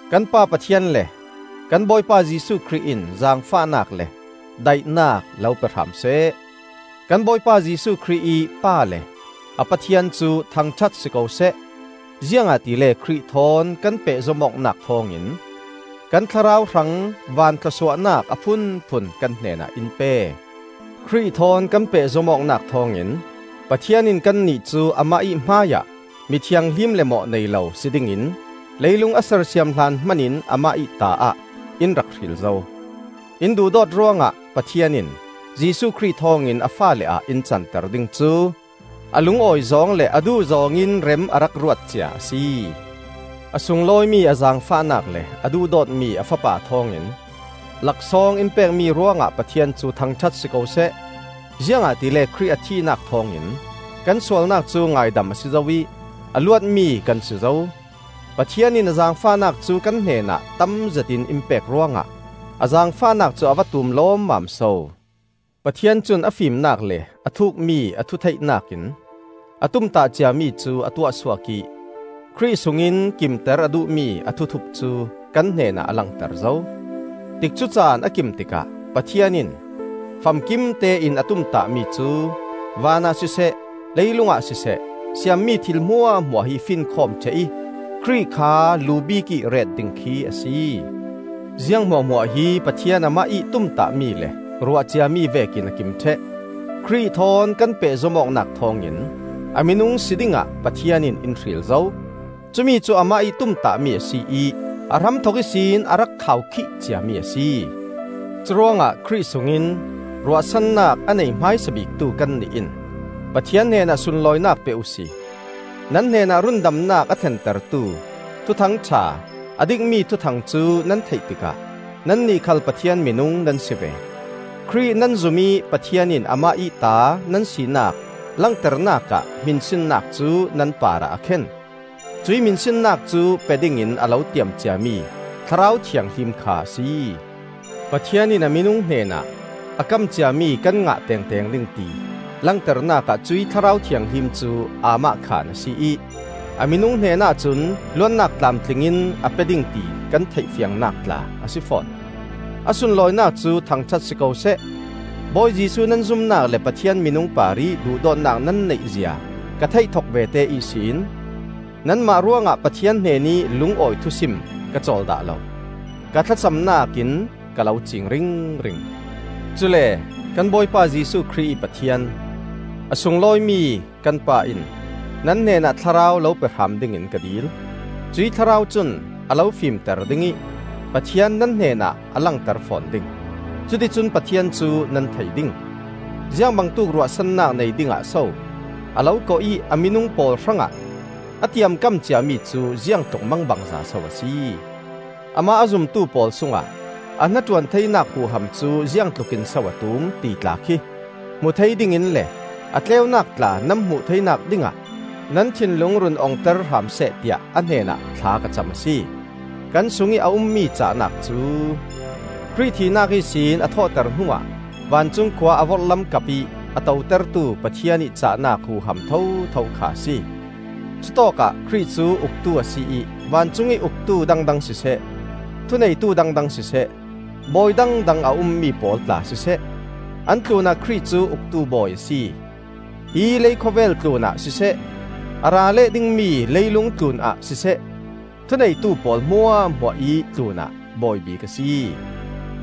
Kan Pa Pathian le kan Bawipa Jesuh Khrih in zaangfahnak le daihnak lo pe hram seh. Kan Bawipa Jesuh Khrih ih Pa le a Pathian cu thangṭhat si ko seh! Ziangahtile Khrih thawn kan pehzom awknak thawngin kan thlarau hrang van thlawsuahnak a phunphun kan hnenah in pe. Khrih thawn kan pehzom awknak thawngin Pathian in kannih cu Amah ih hmaiah mi thianghlim le mawh nei lo si dingin leilung a sersiam hlan hman in Amah ih ta-ah in rak hril zo. In duhdawt ruangah, Pathian in Jesuh Khrih thawngin a faale ah in canter ding cu a lungawi zawng le a duh zawng in rem a rak ruat cia a si. A sunglawimi a zaangfahnak le a duhdawtmi a Fapa thawngin laksawng in pekmi ruangah Pathian cu thangṭhat si ko seh! Ziangahtile Khrih a thihnak thawngin kan sualnak cu ngaidam a si zo ih a luatmi kan si zo. Pathian in a zaangfahnak cu kan hnenah tam zetin in pek ruangah, a zaangfahnak cu a va tum lawmmam so! Pathian cun a fimnak le a thuukmi a thutheihnak in a tumtah ciami cu a tuahsuak ih Khrih sungin kimter a duhmi a thuthup cu kan hnenah a langter zo. Tikcu caan a kim tikah Pathian in famkim tein a tumtah mi cu: vanah siseh, leilungah siseh siammi thil hmuahhmuah hi finkhawm ṭheh ih Khrih kha lu bikih ret ding khi a si. Ziang hmuahhmuah hi Pathian amah ih tumtahmi le ruahciami vekin a kim ṭheh. Khrih thawn kan pehzom awknak thawngin a minung si dingah Pathian in in hril zo; cumicu amah ih tumtahmi a si ih a hramthok ihsin a rak khaukhih ciami a si. Curuangah Khrih sungin ruahsannak a nei hmaisa biktu kannih in Pathian hnenah sunlawinak pe uhsi. Nan hnenah rundamnak a thlentertu Thuthang ṭha a dikmi thuthang cu nan theih tikah nannih khal Pathian minung nan si ve. Khrih nan zum ih Pathian in amah ih ta nan sinak langternak ah hminsinnak cu nan parah a khen; cuih hminsinnak cu pe dingin a lo tiam ciami Thlarau Thianghlim kha a si. Pathian in a minung hnenah a kam ciami kan ngah tengteng ding ti langternak ah cuih Thlarau Thianghlim cu aamahkhan a si ih a minung hnenah cun luatnak tlamtling in a pe ding ti kan theih fiangnak tla a si fawn. A sunlawinak cu thangṭhat si ko seh. Bawi Jesuh nan zumnak le Pathian minung parih duhdawtnak nan neih zia ka theih thok vete ihsin, nanmah ruangah Pathian hnenih lungawi thusim ka cawl dah lo. Ka thlacamnak in ka lo ciing ringring. Cule kan Bawipa Jesuh Khrih ih Pathian, a sunglawimi kan Pa in, nan hnenah Thlarau lo pe hram dingin ka dil. Cuih Thlarau cun a lo fimter ding ih Pathian nan hnenah a langter fawn ding; cuticun Pathian cu nan thei ding. Ziangbangtuk ruahsannak nei dingah so a lo kawh ih a minung pawl hrangah a tiamkam ciami cu ziangtluk mangbangza so a si. Amah a zumtu pawl sungah a hnaṭuan theinak huham cu ziangtlukin so a tum, ti tla khi hmu thei dingin le a tleunak tla nan hmuh theinak dingah nan thinlung run ongter hram seh, tiah a hnenah thla ka cam a si. Kan sungih a ummi cahnak cu, Khrih thihnak ihsin a thawhter hnuah vancung khua a vorhlam kapih a totertu Pathian ih cahnak huham thotho kha a si. Cutawkah Khrih cu uktu a si ih vancungih uktu dangdang siseh, thuneitu dangdang siseh, bawi dangdang a ummi pawl tla siseh, an tlunah Khrih cu uktu bawi a si. Hi leikhawvel tlunah siseh, a ra leh dingmi leilung tlunah siseh, thuneitu pawl hmuahhmuahih tlunah Bawi bik a si.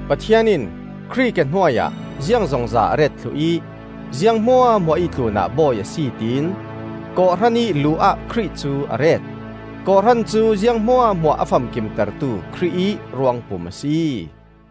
Pathian in Khrih ke hnuai ah ziangzongza a ret thluh ih ziang hmuahhmuah ih tlunah Bawi a si tiin kawhhran ih lu ah Khrih cu a ret. Kawhhran cu ziang hmuahhmuah a famkimtertu Khrih ih ruangpum a si.